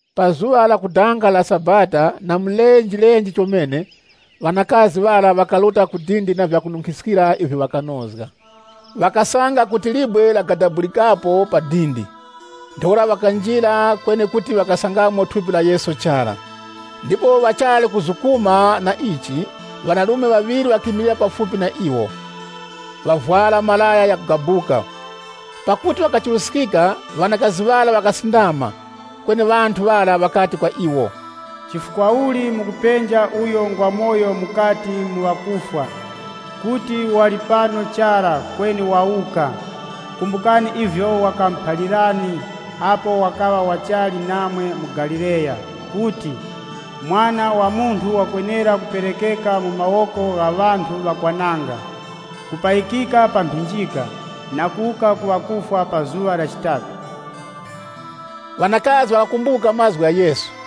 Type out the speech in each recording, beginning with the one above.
Pa zuŵa lakudanga la sabata na mulenje chomene, ŵanakazi ŵara ŵakaruta ku dindi na vyakununkhiskira ivyo ŵakanozga. Ŵakasanga kuti libwe lagadabulikapo pa dindi. Ntheura ŵakanjira kweni kuti ŵakasangamo thupi la Fumu Yesu chara. Ndipo ŵachali kuzukuma na ichi, ŵanarume ŵaŵiri ŵakimilira pafupi na iwo, ŵavwara malaya ghakugabuka. Pakuti wakachiruskika, ŵanakazi ŵara ŵakasindama. Kweni ŵanthu ŵara ŵakati kwa iwo, “Chifukwa uli mukupenja uyo ngwamoyo mukati mu ŵakufwa? Kuti wali pano chara kweni wawuka! Kumbukani ivyo wakamuphalirani apo wakaŵa wachali namwe mu Galileya kuti, ‘Mwana wa Munthu wakwenera kuperekeka mu mawoko gha ŵanthu ŵakwananga, kupayikika pa mphinjika, na kuwuka ku ŵakufwa pa zuŵa la chitatu.’” Ŵanakazi ŵakakumbuka mazgu gha Yesu.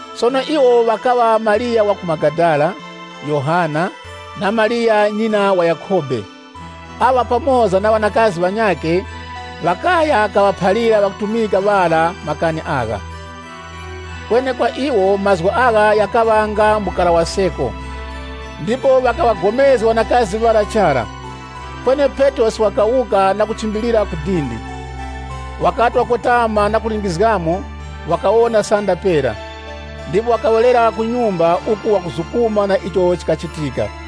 Sono iwo ŵakaŵa Mariya wa ku Magadala, Yohana, Mariya ŵanyina wa Yakhobe. Aŵa pamoza na ŵanakazi ŵanyakhe ŵakaya kaŵaphalira ŵakutumika ŵara makani agha. Kweni kwa iwo, mazgu agha ghakaŵa nga nga uchindere. Ndipo ŵakaŵagomezga ŵanakazi ŵara chara. Kweni Petrosi wakawuka na kuchimbilira ku dindi. Wakati wakotama na kulingizgamo, wakawona sanda pera, ndipo wakawerera ku nyumba uku wakuzukuma na icho chikachitika.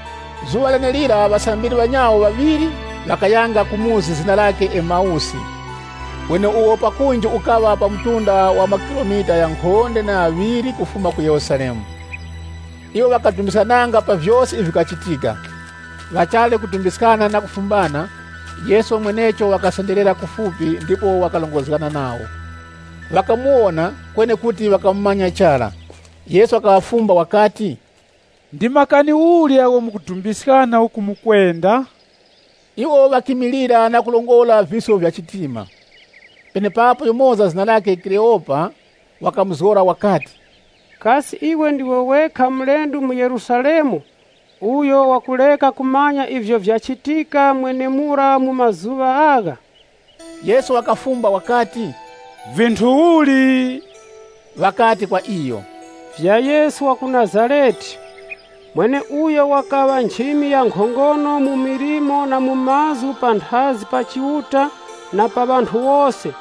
Zuŵa lenelira ŵasambiri ŵanyawo ŵaŵiri ŵakayanga ku chikaya zina lakhe Emawusi, icho pakunji chikaŵa pa mtunda wa makilomita ghankhonde na ghaŵiri kufuma ku Yerusalemu. Iwo ŵakadumbiskananga pa vyose ivyo vikachitika. Ŵachali kudumbiskana na kufumbana, Yesu mwenecho wakasenderera kufupi ndipo wakarongozgana nawo. Ŵakamuwona, kweni kuti ŵakamumanya chara. Yesu wakaŵafumba wakati, “Ndi makani uli agho mukudumbiskana uku mukwenda?” Iwo ŵakimilira na kurongora visko vya chitima. Penepapo yumoza zina lakhe Kleopa, wakamuzgora wakati, “Kasi iwe ndiwe wekha mulendo mu Yerusalemu uyo wakureka kumanya ivyo vyachitika mwenemura mu mazuŵa agha?” Yesu wakafumba wakati, “Vinthu uli?” Ŵakati kwa iyo, “Vya Yesu wa ku Nazarete, mweneuyo wakaŵa nchimi ya nkhongono mu milimo na mu mazgu panthazi pa Chiuta na pa ŵanthu wose,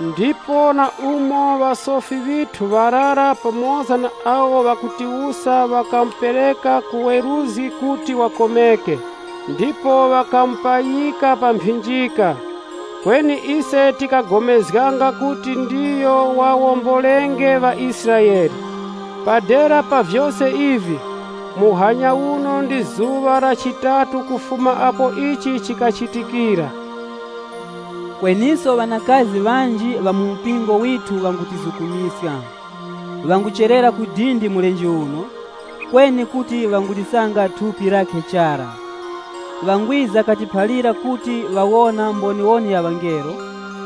ndipo na umo ŵasofi ŵithu ŵarara pamoza na awo ŵakutiwusa ŵakamupereka ku weruzgi kuti wakomeke, ndipo ŵakamupayika pa mphinjika. Kweni ise tikagomezganga kuti ndiyo waŵawombolenge ŵaIsraele. Pa dera pa vyose ivi, muhanya uno ndi zuŵa la chitatu kufuma apo ichi chikachitikira. Kweniso ŵanakazi ŵanji ŵa mu mpingo withu ŵangutizukumiska. Ŵangucherera ku dindi mulenje uno, kweni kuti ŵangulisanga thupi lakhe chara. Ŵangwiza katiphalira kuti ŵawona mboniwoni ya ŵangelo,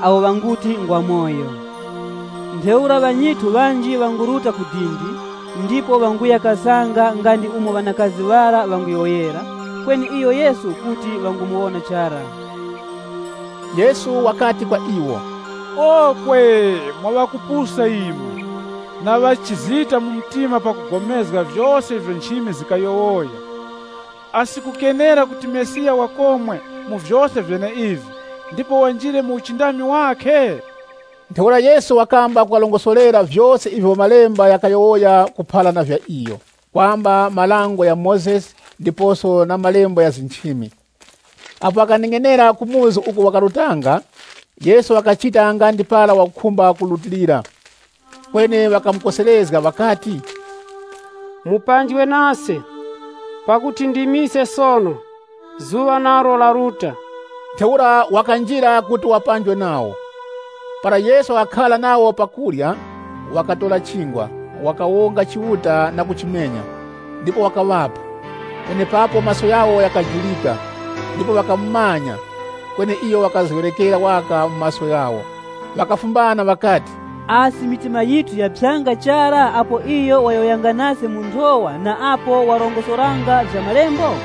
awo ŵanguti ngwamoyo. Ntheura ŵanyithu ŵanji ŵanguruta ku dindi, ndipo ŵanguya kasanga nga ndi umo ŵanakazi ŵara ŵanguyowoyera, kweni iyo Yesu kuti ŵangumuwona chara.” Yesu wakati kwa iwo, “Okwe! Mwa ŵakupusa imwe, na ŵachizita mu mtima pakupulikana na vyose ivyo nchimi zikayowoya. Asi kukenera kuti Mesiya wakomwe mu vyose vyeneivi, ndipo wanjirenge mu uchindami wakhe?” Ntheura Yesu wakamba kuŵarongosorera vyose ivyo malembo ghakuyowoya kuphara na vya iyo, kwamba dango la Mozesi ndiposo na malembo gha nchimi. Apo ŵakaneng'enera ku chikaya uko ŵakarutanga, Yesu wakachita nga ndi para wakukhumba kurutilira. Kweni ŵakamukoserezga ŵakati, “Mupanjwe nase, pakuti ndi mise sono, zuŵa nalo laruta.” Ntheura wakanjira kuti wapanjwe nawo. Para Yesu wakakhara nawo pa chakurya, wakatora chingwa, wakawonga Chiuta na kuchimenya ndipo wakaŵapa. Penepapo maso ghawo ghakajurika ndipo ŵakamumanya, kweni iyo wakazgeŵerekera waka mu maso ghawo. Ŵakafumbana ŵakati, “Asi mitima yithu yaphyanga chara apo iyo wayowoyanga nase mu nthowa na apo warongosoranga vya malembo?”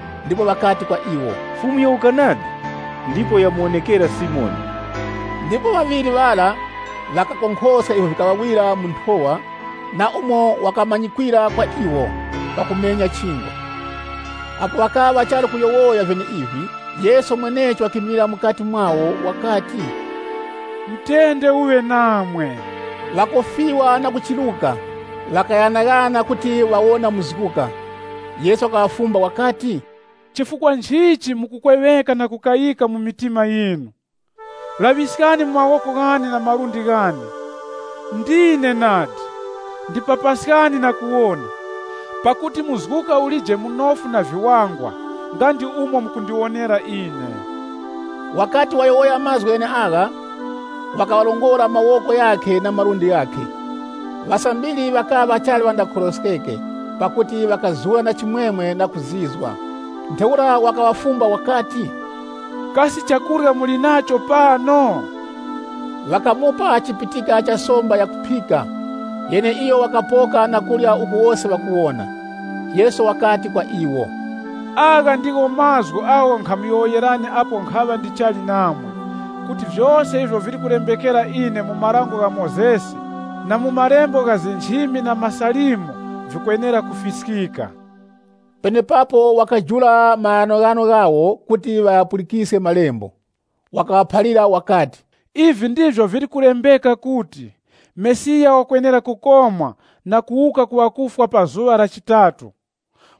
ndipo ŵakati kwa iwo, “Fumu yawuka nadi! Ndipo yamuwonekera Simoni.” Ndipo ŵaŵiri ŵara ŵakakonkhoska ivyo vikaŵawira mu nthowa, na umo wakamanyikwira pakumenya kwa chingwa. Apo ŵakaŵa ŵachali kuyowoya vyeneivi, Yesu mwenecho wakimilira mukati mwawo wakati, “Mutende uŵe namwe.” Ŵakopa na kuchiruka, ŵakaghanaghananga kuti ŵawona muzguka. Yesu wakaŵafumba wakati, “Chifukwa nchichi mukukweŵeka na kukayika mu mitima yinu? Laŵiskani mu mawoko ghane na malundi ghane. Ndine nadi! Ndipapaskani na kuwona, pakuti muzguka ulije munofu na viwangwa nga ndi umo mukundiwonera ine.” Wakati wayowoya mazgu gheneagha, wakaŵarongora mawoko ghakhe na malundi ghakhe. Ŵasambiri ŵakaŵa ŵachali ŵandagomezge, pakuti ŵakazura na chimwemwe na kuzizwa, wakati kwa iwo, “Kasi chakurya muli nacho pano?” Ŵakamupa chipitika cha somba yakuphika, yeneiyo wakapoka na kurya uku wose ŵakuwona. Yesu wakati kwa iwo, “Agha ndiwo mazgu agho nkhamuyowoyerani apo nkhaŵa ndichali namwe, kuti vyose ivyo vili kulembekera ine mu Dango la Mozesi na mu malembo gha nchimi na MaSalimo vikwenera kufiskika.” Penepapo wakajula maghanoghano ghawo kuti ŵaghapulikiske malembo. Wakaŵaphalira wakati, “Ivi ndivyo vili kulembeka kuti, Mesiya wakwenera kukomwa na kuwuka ku ŵakufwa pa zuŵa la chitatu,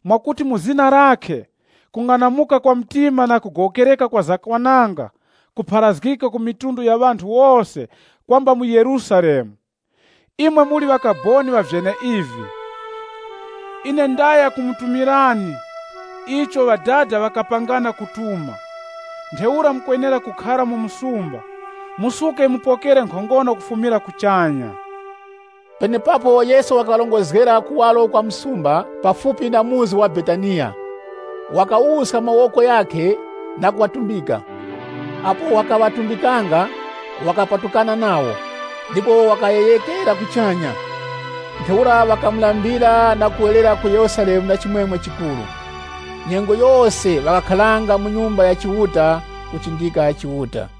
mwakuti mu zina lakhe, kung'anamuka kwa mtima na kugowokereka kwa zakwananga kupharazgike ku mafuko ghose kwamba mu Yerusalemu. Imwe muli ŵakaboni ŵa vyeneivi. Ine ndaya kumutumirani icho Ŵadada ŵakapangana kutuma. Ntheura mukwenera kukhara mu msumba, musuke mupokere nkhongono kufumira kuchanya.” Penepapo Yesu wakaŵarongozgera kuwaro kwa msumba, pafupi na muzi wa Betaniya. Wakawuska mawoko ghakhe na kuŵatumbika. Apo wakaŵatumbikanga, wakapatukana nawo, ndipo wakayeghekera kuchanya. Ntheura ŵakamulambira na kuwerera ku Yerusalemu na chimwemwe chikuru. Nyengo yose ŵakakharanga mu Nyumba ya Chiuta, kuchindika Chiuta.